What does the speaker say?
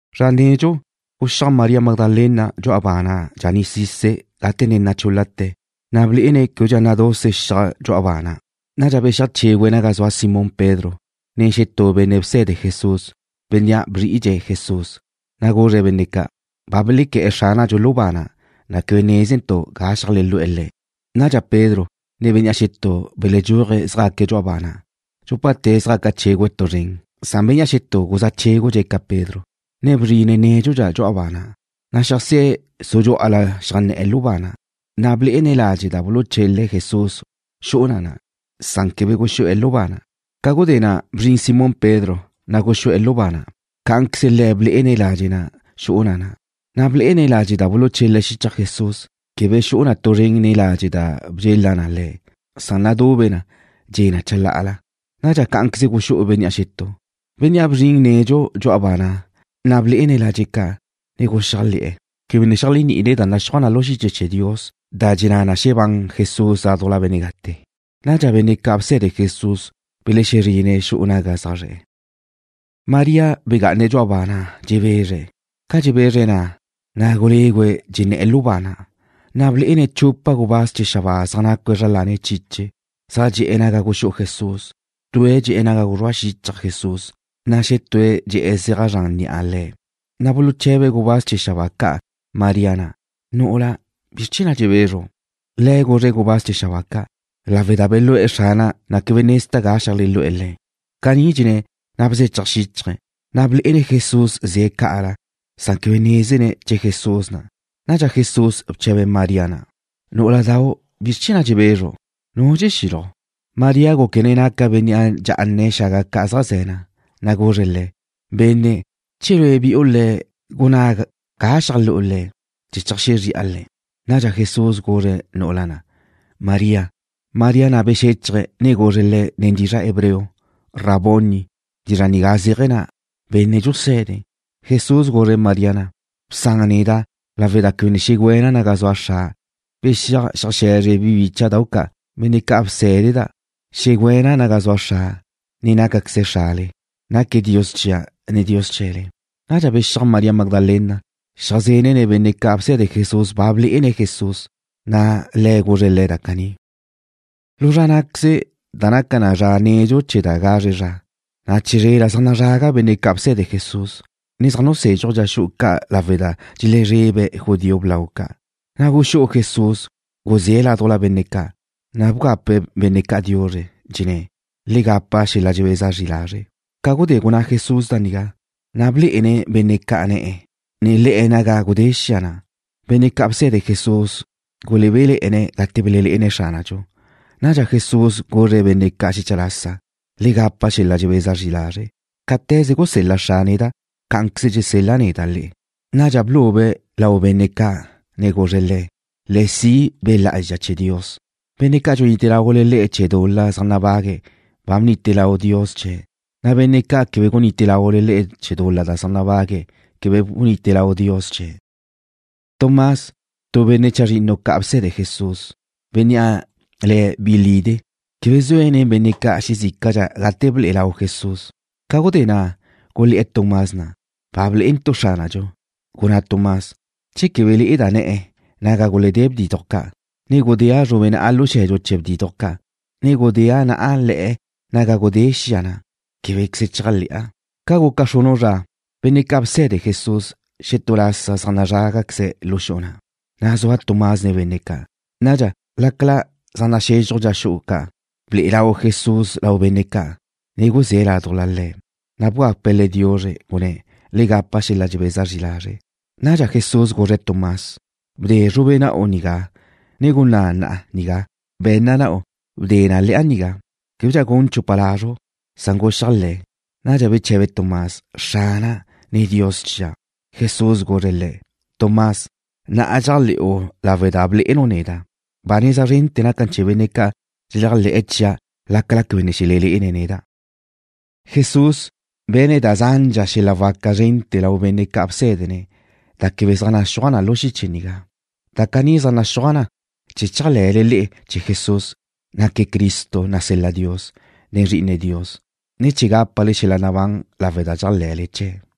Zra nedxu, guxíaj María Magdalena dxu'a ba na' dxaní'sise̱', gate ne nachúl-late̱, na' blé'ene̱' québedxa naduse xiaj dxu'a ba na'. Nadxa bexíaj chégüe̱' naga zua Simón Pedro nen xetú benne' bse̱de Jesús, bénnea' bzri'idxe̱' Jesús, na' guzre̱' benne' ca': ―Ba belequé̱'e̱ Xránadxu lu ba na', ne quebe nézentu' ga xeajlelú'e̱ Le̱'. Nadxa Pedro, ne bénnea' xetú beledxúaje̱' zjaque̱' dxu'a ba na'. Dxúpate̱' zjaca chégüe̱' tu zren, san bénnea' xetú guzá chégudxe̱' ca Pedro, ne bzrine̱' nédxudxa dxu'a ba na'. Na' xeajsé̱' su dxú'ala xeajnné̱'e̱ lu ba na', na' blé'ene̱' ladxe' da buluchele̱' Jesús xu'u na na', san quebe guxú'e̱ lu ba na'. Ca gudé na', bzrin Simón Pedro, na' guxú'e̱ lu ba na'. Cá'anqueze le̱' blé'ene̱' ladxe' na' xu'u na na', ne blé'ene̱' ladxe' da buluchele̱' xichaj Jesús, quebe xu'u na tu zren nen ladxe' da bedxela na le̱'. Nadube na, dxe' na chalá'ala. Nadxa cá'anqueze guxú'u bénnea' xetú, bénnea' bzrin nedxu dxu'a ba na', na' blé'ene̱' ladxe' ca', ne guxéajle̱'e̱. Quebe ne xeléajni'ine̱' da naxúaj na lu xiche chee̱ Dios da dxenná na xebán Jesús ládujla benne' gate'. Nadxa benne' ca' bse̱de Jesús belexezrine̱' xu'u naga zaj zre̱'e̱. María begá'ane̱' dxu'a ba na', dxebezre̱'. Ca dxebezre̱' na', na' gulégüe̱' dxenné̱'e̱ lu ba na', na' blé'ene̱' chupa gubáz chee̱ xabáa zaj nácue̱' zra lane̱' chiche, zaj dxe'e̱ naga guxú'u Jesús. Tue̱' dxe'e̱ naga guzrúa xichaj Jesús, na' xetúe̱' dxe'e̱ zeaj zranle ga guzrúa ni'a Le̱'. Na' buluche̱be gubáz chee̱ xabáa ca' María na': ―Nu'ula, ¿bizr chee̱ na' dxebezru'? Le̱' guzre̱' gubáz chee̱ xabáa ca': ―Lawe' da belú'e̱ Xrana', ne quebe nezda' ga xeajlelú'e̱ Le̱'. Caní dxenné̱', na' bzéchaj xíchaje̱', ne blé'ene̱' Jesús ze̱' ca'ala, san quebe nézene̱' che Jesús na'. Nadxa Jesús bche̱be̱' María na': ―Nú'uladau', ¿bizr chee̱ na' dxebezru'? ¿Nu dxexílaju'? María gúquene̱' naque̱' benne' dxá'ane̱' xaga ca' zaj ze̱ na', na' guzre̱' Le̱': ―Benne', che lue' bi'u Le̱', gunná ga xeajlú'u Le̱', chee̱ cheajxezri'a Le̱'. Nadxa Jesús guzre̱' nu'ula na': ―María. María na' bexéchaje̱', ne guzre̱' Le̱' nen dizra' hebreo: ―¡Raboni! Dizra' nigá zéaje̱ na: Benne' Dxuse̱de. Jesús guzre̱' María na': ―Bsan neda' lawe' da quebe ne xegüéna' naga zua Xra'. Bexíaj, xeajxe̱zre bi bícha'dau' ca', benne' ca' bsé̱deda', xegüéna' naga zua Xra', ne nácaqueze̱' Xrale. Naque̱' Dios chia', ne Dios chee̱le. Nadxa bexíaj María Magdalena, xeajzenne̱' benne' ca' bse̱de Jesús ba blé'ene̱' Jesús, na' Le̱' guzre̱' le̱' da caní. Lu zra ná'queze, da naca na zra nedxu chee̱ da gazre zra, na' chizrela zaj nazraga benne' ca' bse̱de Jesús, ne zaj nusézxuje̱' dxa xu'u ca' lawe' da dxelezrebe̱' judío blau ca'. Na' guxú'u Jesús, guzé̱' laduj benne' ca', na' bgape̱' benne' ca' diuzre, dxenné̱': ―Le gapa xel-la' dxebeza zri lazre'. Ca gudé gunná Jesús da nigá, na' blé'ene̱' benne' ca' ne̱'e̱, ne le̱'e̱ naga gudé xia na'. Benne' ca' bse̱de Jesús gulebéle̱'e̱ne̱' gate belelé'ene̱' Xránadxu. Nadxa Jesús guzre̱' benne' ca' xecha lasa: ―Le gapa xel-la' dxebeza zri lazre'. Cáte̱ze gusel-la Xra' neda', cá'anqueze dxusel-la' neda' le'e. Nadxa blube̱' lau benne' ca' ne guzre̱' le̱': ―Le si' Be' Lá'azxa chee̱ Dios. Benne' ca' dxunite laule le'e chee̱ dul-la zaj nabague̱' ba bnite lau Dios chee̱', na' benne' ca' quebe dxunite laule le'e chee̱ dul-la zaj nabague̱', quebe bunite lau Dios chee̱'. Tomás, tu benne' chazrinnu ca' bse̱de Jesús, bénnea' le̱' Bi Lide', quebe zue̱' nen benne' ca' xezícadxa gate ble'e lau Jesús. Ca gudé na' gulé̱'e̱ Tomás na': ―Ba blé'entu' Xránadxu. Gunná Tomás: ―Che quebe le'eda' ne̱'e̱ naga guledé bdiduj ca', ne gudéa' zrube na'a lu xe̱dxu chee̱ bdiduj ca', ne gudéa' na'a le̱'e̱ naga gudé xia na', québequeze chéajle̱'a. Ca guca xrunu' zra, benne' ca' bse̱de Jesús zaj nazrágaqueze̱' lu xu'u na' xetú lasa, na' zua Tomás nen benne' ca'. Nadxa, lácala zaj naxezxuj dxa xu'u ca', ble'e lau Jesús lau benne' ca', ne guzé̱' laduj le̱', na' bgape̱' le̱' diuzre, gunné̱': ―Le gapa xel-la' dxebeza zri lazre'. Nadxa Jesús guzre̱' Tomás: ―Bde zrube na'u nigá, ne gunná' na'a nigá. Be̱nna na'u, bde na le̱'a nigá. Québedxa gun chupa lazru', san guxéajle̱. Nadxa beche̱be Tomás: ―Xrana', ne Dios chia'. Jesús guzre̱' le̱': ―Tomás, na'a dxéajle̱'u lawe' da ba blé'enu' neda'. Ba neza zrente̱ naca na chee̱ benne' ca' dxeléajle̱'e̱ chia' lácala quebe ne xelelé'ene̱' neda'. Jesús be̱ne̱' da zandxa xel-la' waca zrente̱ lau benne' ca' bsé̱dene̱' da quebe zaj naxúaj na lu xiche nigá. Da caní zaj naxúaj na chee̱ chéajle̱le le'e chee̱ Jesús, naque̱' Cristo nasel-la Dios, ne Zri'ine Dios, ne chee̱ gápale xel-la' nabán lawe' da dxéajle̱le chee̱'.